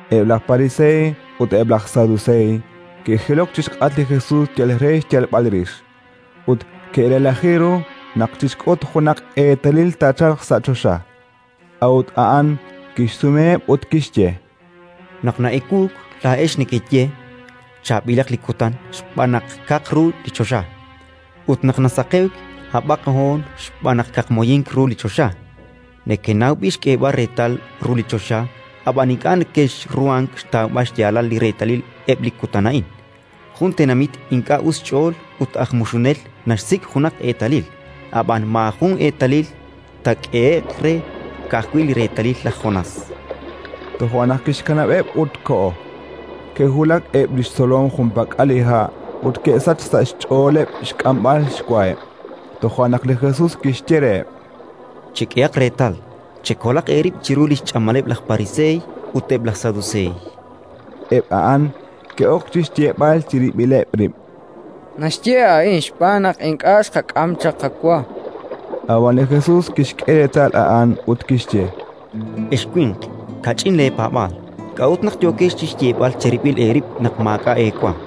Eb' laj Pariseey ut eb' laj Saduseey ke'jilok chi xk'atq li Jesus yal re xyalb'al rix, ut ke'relaji ru naq chixk'ut junaq eetalil taachalq sa' choxa. A'ut a'an kixsumeheb' ut kixye: “Naq na'ewuuk, laa'ex nekeye: «Chaab'ilaq li kutan, xb'aan naq kaq ru li choxa»; ut naq nasaqewk: «Hab'aq hoon, xb'aan naq kaqmoyink ru li choxa». Nekenaw b'i' xk'eeb'al reetal ru li choxa, ab'an ink'a' nekexruhank xtawb'al xyaalal li reetalil eb' li kutan a'in. Jun tenamit ink'a' us xch'ool ut aj muxunel naxsik' junaq eetalil; ab'an maajun eetalil taak'ehe'q re, ka'ajwi' li reetalil laj Jonás”. Toja' naq kixkanab'eb' ut koho. Ke'wulak eb' li xtzolom junpak'al li ha' ut ke'sachk sa' xch'ooleb' xk'amb'al xwaheb'. Toja' naq li Jesus kixye reheb': —Chek'ehaq reetal, chekolaq eerib' chiru li xch'amaleb' laj Pariseey ut eb' laj Saduseey. Eb' a'an ke'ok chi xyeeb'al chirib'ileb' rib': —Naxye a'in xb'aan naq ink'a' xqak'am chaq qawa. Ab'an li Jesus kixk'e reetal a'an ut kixye: —Ex winq kach'in leepaab'aal, k'a'ut naq yookex chi xyeeb'al cherib'il eerib' naq maak'a' eewa?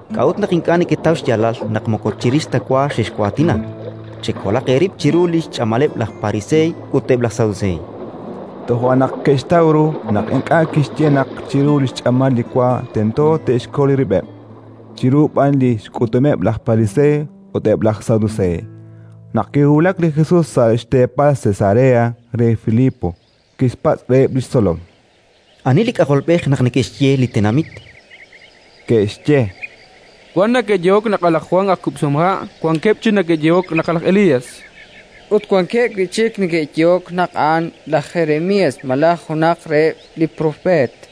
K'a'ut naq ink'a' neketaw xyaalal naq moko chirix ta wa xexwaatina? Chekolaq eerib' chiru li xch'amaleb' laj Pariseey ut eb' laj Saduseey. Toja' naq ke'xtaw ru naq ink'a' kixye naq chiru li xch'amal li wa tento te'xkol rib'eb', chiru b'an li xk'utumeb' laj Pariseey ut eb' laj Saduseey. Naq kiwulak li Jesus sa' xteepal Cesarea re Filipo, kixpatz' reheb' li xtzolom: —Ani li K'ajolb'ej naq neke'xye eb' li tenamit? Ke'xye: —Wan neke'yehok naq a' laj Jwan aj kub'sihomha'. Wankeb' chik neke'yehok naq laj Elías, ut wankeb' wi' chik neke'yehok naq a'an laj Jeremías malaj junaq reheb' li propeet.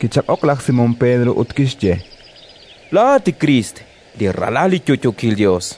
Kichaq'ok laj Simón Pedro ut kixye: —Laa'at li Kriist, li Ralal li yo'yookil Yos.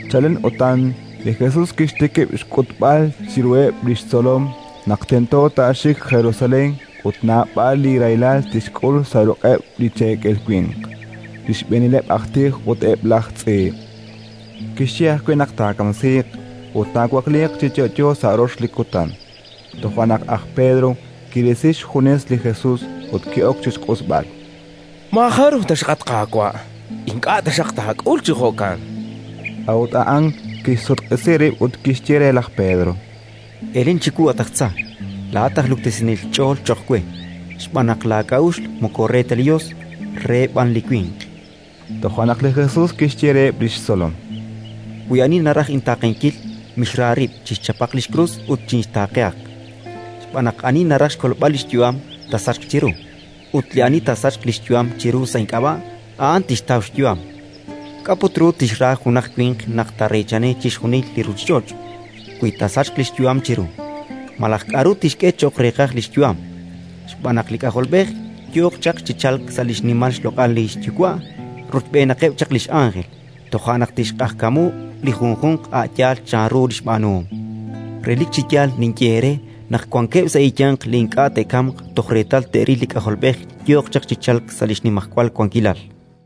Chalen utan li Jesus kixtikib' xk'utb'al chiruheb' li xtzolom naq tento taaxik Jerusalén ut naab'al li rahilal tixk'ul sa' ruq'eb' li cheekel winq, li xb'eenileb' aj tij ut eb' laj tz'iib'; kixye ajwi' naq taakamsiiq ut taawakliiq chi yo'yo sa' rox li kutan. Toja' naq aj Pedro kirisi xjunes li Jesus ut ki'ok chi xq'usb'al: —Maajaruj ta xaq, at Qaawa'! Ink'a' taxaq taak'ul chi jo'kan, chan re. A'ut a'an kixsutq'isi rib' ut kixye re laj Pedro: —Elen chiwu, at aj tza! Laa'at aj luktesinel ch'ool cho'q we, xb'aan naq laak'a'uxl moko re ta li Yos, reheb' b'an li winq. Toja' naq li Jesus kixye reheb' li xtzolom: —Wi ani naraj intaaqenkil, mixra rib', chixchapaq li xkrus ut chinxtaaqehaq. Xb'aan naq ani naraj xkolb'al li xyu'am, taasachq chiru; ut li ani taasachq li xyu'am chiru sa' ink'ab'a', a'an tixtaw xyu'am. K'a' put ru tixra junaq winq naq taareechani chixjunil li ruuchich'och', wi taasachq li xyu'am chiru? Malaj k'aru tixk'e cho'q reeqaj li xyu'am? Xb'aan naq li K'ajolb'ej yooq chaq chi chalk sa' li xnimal xloq'al li xYuwa' rochb'eenaqeb' chaq li x'ánjel; toja' naq tixq'ajkamu li junjunq a' yaal chanru li xb'aanuhom. Relik chi yaal ninye eere naq wankeb' sa' eeyanq li ink'a' te'kamq toj reetal te'ril li K'ajolb'ej yooq chaq chi chalk sa' li xnimajwal wankilal.